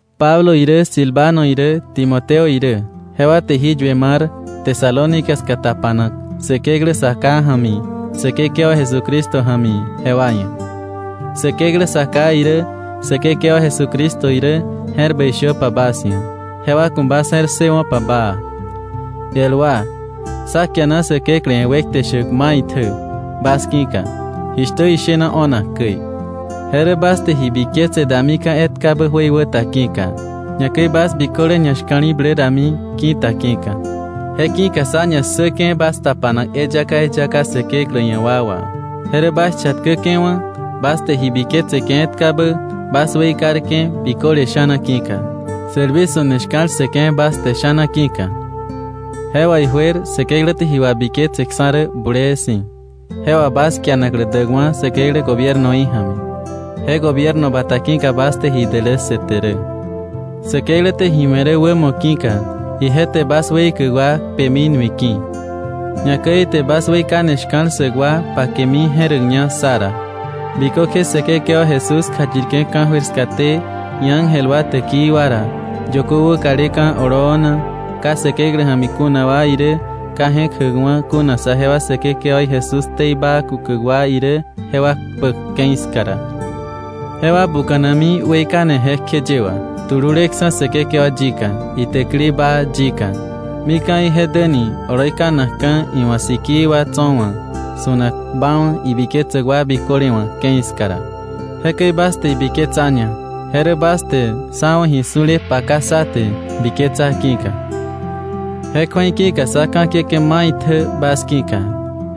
Pablo irä, Silvano irä, Timoteo irä, jewa te jí yue mar Tesalónica ska tapanak Säkeklä Sa Ká ja̱mi Säkekewa Jesucristo ja̱mi jewa ia̱. Säkeklä Sa Ká irä Säkekewa Jesucristo irä, je̱r bäi shöpa bas ia̱, jewa ku̱ bas je̱r ssëwo̱pa baa. El wa, sá kiana Säkeklä ia̱ wekte shäk maitjä bas ki̱ka jishtä ishena o̱nak käi. Je rä bas te ji biketse damika̱ etkabä jöikwä ta ki̱ka, ñakäi bas biköle ñashka̱li̱blä dami ki̱ta ki̱ka. Je ki̱ka sá ñassäke̱ bas tapanak eyaka eyaka Säkeklä ia̱ wa wà, je rä bas chatkäke̱wa̱, bas te ji biketseke̱ etkabä, bas weikarke̱ biköle sha̱na ki̱ka, sälwi su̱ne shka̱l ssëke̱ bas te sha̱na ki̱ka. Je wà ijuer Säkeklä te ji wabiketseksa̱ rä bulee si̱, je wà bas kianaklä däkwa̱ Säkeklä gobiernoí ja̱mi. Je gobierno bata ki̱ka bas te ji dälässëte rä. Säkeklä te ji we̱ rä wämo ki̱ka ije te bas weikäk wa kpemi nui ki̱, ñakäi ite bas weikane shka̱l ssäk wa pakemi je̱räkña sá ra, bikökje Säkekewa Jesús kjayirke̱ ka̱jöir skaté iángel wa täkii wa ra, yökö wäkaleka̱ oloo na, ka Säkeklä ja̱mi kuna wa irä, ka je̱k jäkwa̱ kuna saje wa Säkekewaí Jesús ktei baa kukäk wa irä, jewa kpäk ke̱i ska ra. Jewa buka̱nami weikane jekjeye wà, tululeksa̱ Säkekewa yika, itäkili baa yika, mika̱ ije däni oloi kanakka̱ iwa̱ sikii wa tso̱ wa̱, su̱nak baawa̱ ibiketsäk wa biköle wa̱ ke̱i ska ra. Jekäi bas te ibiketsaña, je rä bas te sá wa̱ ji su̱le paka sá te biketsa ki̱ka. Je kju̱ei ki̱ka sá ka̱kiäke̱ maitjä bas ki̱ka,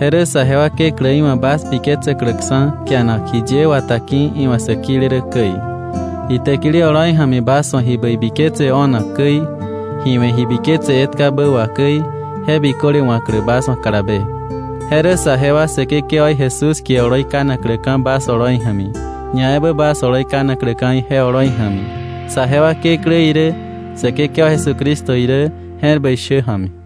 je rä saje wa Kekläí wa̱ bas biketsäkläksa̱ kianak jiye wata ki̱ iwa̱ sä kile rä käi, itäkili oloi ja̱mi bas wa̱ ji bäi biketse o̱nak käi, ji we̱ ji biketse etkabä wà käi, je biköle wa̱klä bas wa̱ kalabe. Je rä saje wa Säkekewaí Jesús kie oloi kanakläka̱ bas oloi ja̱mi, ñaebä bas oloi kanakläka̱ ije oloi ja̱mi, saje wa Kekläí irä Säkekewa Jesucristo irä je̱r bäi shä ja̱mi.